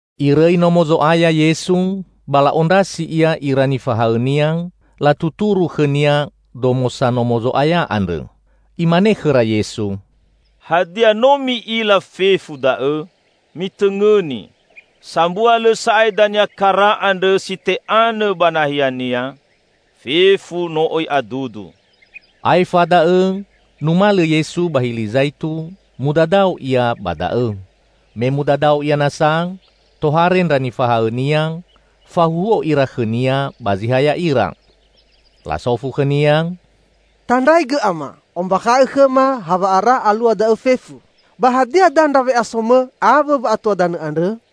Irõi Nomo Zo'aya Yesu, ba la'ondrasi Ia ira nifahaõ-Nia, latuturu khõ-Nia domosa Nomo Zo'aya andrõ. Imane khõra Yesu, "Hadia, no mi'ila fefu da'õ? Mitõngõni! Sambua lõ sa'ae dania kara andrõ si te'anõ ba nahiania. Fefu no oi adudu." Aefa da'õ numalõ Yesu ba Hili Zaitu, mudadao Ia ba da'õ. Me mudadao Ia nasa, tohare ndra nifahaõ-Nia, fahuhuo ira khõ-Nia ba zi ha ya'ira. Lasofu khõ-Nia, "Tandraigõ Ama, ombakha'õ khõma hawa'ara alua da'õ fefu? Ba hadia dandra we'aso-Mõ awõ wa'atua danõ andrõ?"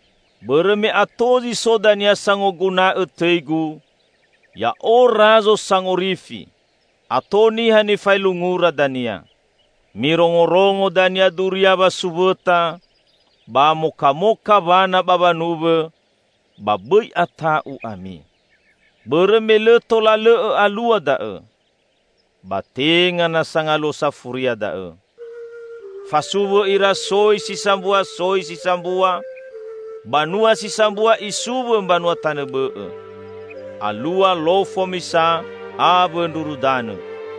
Bõrõ me ato zi so dania sangoguna'õ tõi-Gu, 'Ya'o Razo Sangorifi!' Ato niha nifaelungura dania. Mirongorongo dania duria wasuwõta ba mokamoka wana ba wanuwõ, ba bõi ata'u ami. Bõrõ me lõ tola lõ'õ alua da'õ. Ba tenga nasa Ngaluo Safuria da'õ. Fasuwõ ira soi si sambua soi si sambua, banua si sambua isuwõ mbanua tanõ bõ'õ. Alua lofo misa awõ ndruru danõ.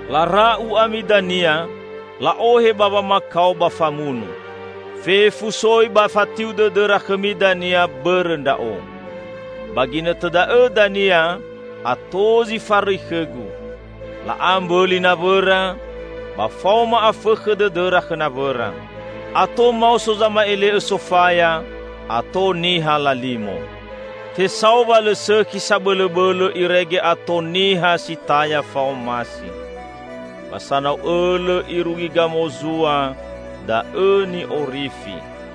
Lara'u ami dania, la'ohe ba wamakao ba famunu. Fefu soi ba fatiu dõdõra khõmi dania bõrõ Ndra'o. Ba ginõtõ da'õ dania ato zi farõi khõ-Gu. La'a mbõli nawõra ba faoma afõkhõ dõdõra khõ nawõra. Ato maoso zama'ele'õ sofaya, ato niha lalimo. Tesao wa lõ sõkhi sabõlõbõlõ irege ato niha si taya fa'omasi. Ba sanau õlõ irugi gamozua da'õ ni'orifi.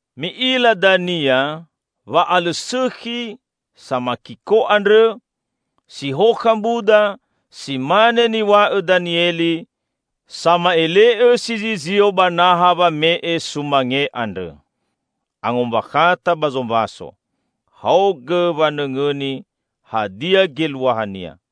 "Mi'ila dania 'Wa'alõsõkhi samakiko andrõ', si hokha mbuda, si mane niw̃a'õ Danieli, sama'ele'õ si zizio ba naha wame'e sumange andrõ. (Angombakhata ba zombaso: Haogõ wanõngõni hadia geluahania!)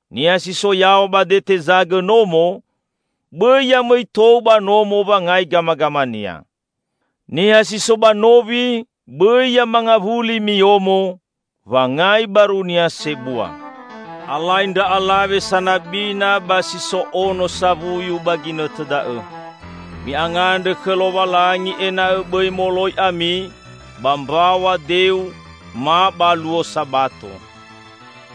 Niha si so yaw̃a ba dete zagõ nomo bõi ya mõi tou ba nomo wanga'i gamagamania. Niha si so ba nowi bõi ya mangawuli miyomo wangai barunia sebua. Alai ndra alawe sanabina ba si so ono sawuyu ba ginõtõ da'õ! Mi'angandrõ khõ Lowalangi ena'õ bõi moloi ami ba mbaw̃a deu ma ba luo Sabato!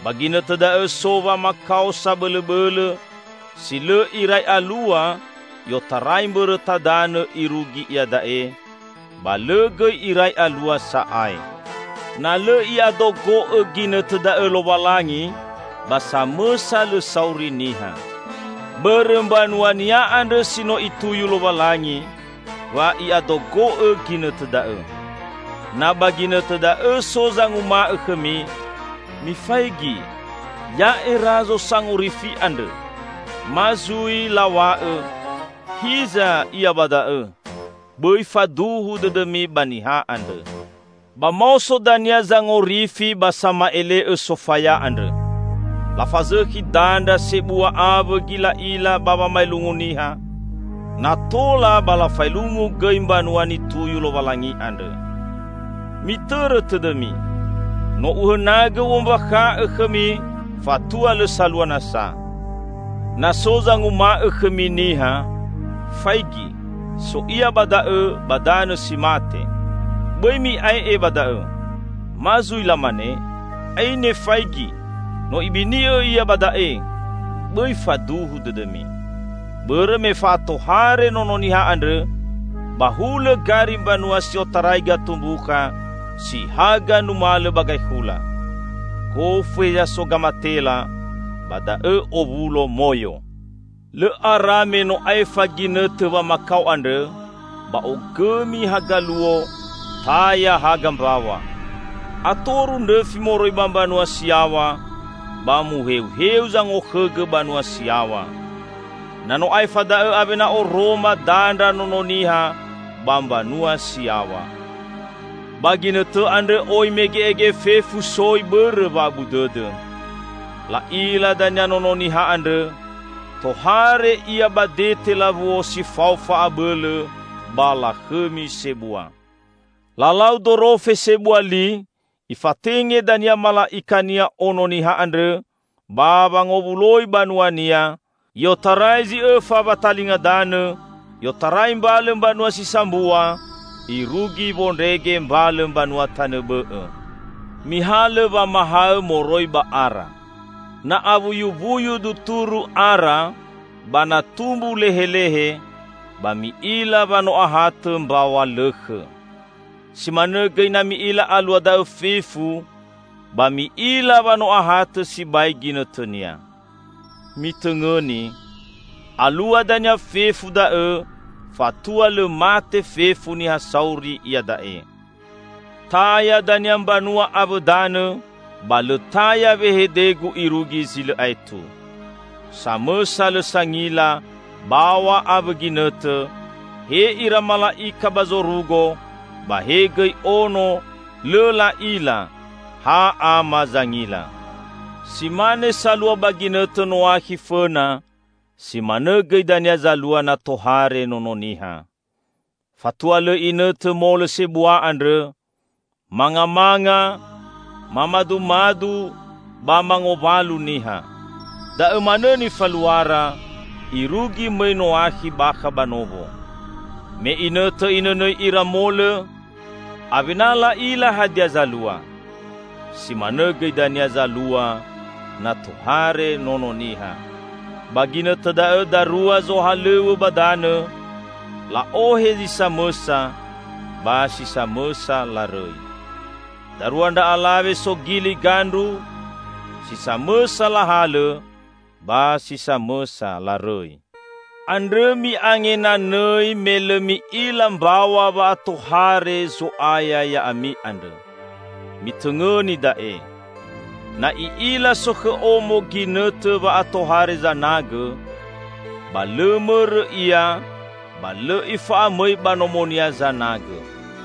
Ba ginõtõ da'õ so wamakao sabõlõbõlõ si lõ irai alua i'otarai mbõrõta danõ irugi iada'e; ba lõ gõi irai alua sa'ae. Na lõ I'adogo'õ ginõtõ da'õ Lowalangi, ba samõsa lõ sauri niha. Bõrõ mbanua-Nia andrõ si no Ituyu Lowalangi, wa I'adogo'õ ginõtõ da'õ. Na ba ginõtõ da'õ so zanguma'õ khõmi, 'Mifaigi, ya'e Razo Sangorifi andrõ!' Ma zui law̃a'õ, 'Hiza Ia ba da'õ!' -- bõi faduhu dõdõmi ba niha andrõ. Ba maoso dania zangorifi ba sama'ele'õ sofaya andrõ. Lafazõkhi dandra sebua awõ gila'ila ba wamaelungu niha, na tola ba lafaelungu gõi mbanua nituyu Lowalangi andrõ. Mitõrõ tõdõmi! No Uhõnagõ U'ombakha'õ khõmi fatua lõ salua nasa. Na so zanguma'õ khõmi niha, 'Faigi, so Ia ba da'õ ba danõ si mate!' -- Bõi mi'ae'e ba da'õ. Ma zui lamane, 'Aine faigi, no ibini'õ Ia ba da'e!' -- bõi faduhu dõdõmi. Bõrõ me fa'atohare Nono Niha andrõ ba hulõ gari mbanua si otarai gatumbukha si haga numalõ ba gaekhula. Gofu heza so gamatela, ba da'õ owulo moyo." "Lõ ara me no aefa ginõtõ wamakao andrõ, ba ogõmi haga luo, taya haga mbaw̃a. Atoru ndrõfi moroi ba mbanua si yaw̃a, ba muheuheu zangokhõgõ banua si yaw̃a. Na no aefa da'õ awena oroma dandra Nono Niha ba mbanua si yaw̃a. Ba ginõtõ andrõ oi mege'ege fefu soi bõrõ wa'abu dõdõ. La'ila dania Nono Niha andrõ, tohare Ia ba dete lawuo si fao fa'abõlõ ba lakhõmi sebua. Lalau dorofe sebua li, Ifatenge dania mala'ika-Nia Ono Niha andrõ ba wangowuloi banua-Nia i'otarai zi õfa watalinga danõ, i'otarai mbalõ mbanua si sambua irugi wondrege mbalõ mbanua tanõ bõ'õ." "Mihalõ wamahaõ moroi ba ara. Na awuyuwuyu duturu ara ba na tumbu lehelehe, ba mi'ila wa no ahatõ mbaw̃a lõkhõ. Si manõ gõi na mi'ila alua da'õ fefu, ba mi'ila wa no ahatõ sibai ginõtõnia. Mitõngõni! Alua dania fefu da'õ fatua lõ mate fefu niha sauri iada'e. Taya dania mbanua awõ danõ, ba lõ taya wehede-Gu irugi zi lõ aetu." "Samõsa lõ sangila baw̃a awõ ginõtõ, he ira mala'ika ba zorugo ba he gõi Ono lõ la'ila; ha Ama zangila. Si mane salua ba ginõtõ Noakhi fõna, si manõ gõi dania zalua na tohare Nono Niha. Fatua lõ inõtõ molõ sebua andrõ, mangamanga, mamadumadu, ba mangowalu niha. Daõ manõ nifaluara, irugi mõi Noakhi bakha ba nowo. Me inõtõ inõnõi ira molõ, awena la'ila hadia zalua. Si manõ gõi dania zalua na tohare Nono Niha. Ba ginõtõ da'õ darua zohalõw̃õ ba danõ; la'ohe zi samõsa ba si samõsa larõi. Darua ndra alawe sogili gandru: si samõsa lahalõ ba si samõsa larõi. Andrõ mi'angenanõi me lõ mi'ila mbaw̃a wa'atohare Zo'aya ya'ami andrõ. Mitõngõni da'e! Na i'ila sokhõ omo ginõtõ wa'atohare zanagõ, ba lõ mõrõ ia ba lõ ifa'amõi ba nomonia zanagõ.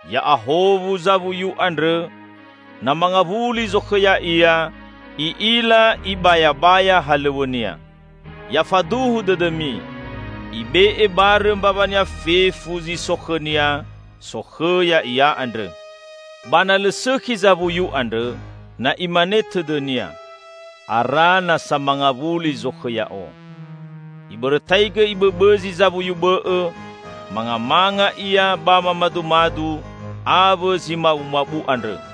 Ya'ahowu zawuyu andrõ, na mangawuli zokhõ ya'ia, i'ila ibayabaya halõw̃õnia. Ya faduhu dõdõmi, ibe'e barõ mbawania fefu zi so khõnia sokhõ ya'ia andrõ. Ba na lõ sõkhi zawuyu andrõ, na imane tõdõnia, 'Ara nasa mangawuli zokhõ ya'o,' ibõrõtaigõ ibõbõzi zawuyu bõ'õ, mangamanga ia ba mamadumadu awõ zi mabumabu andrõ.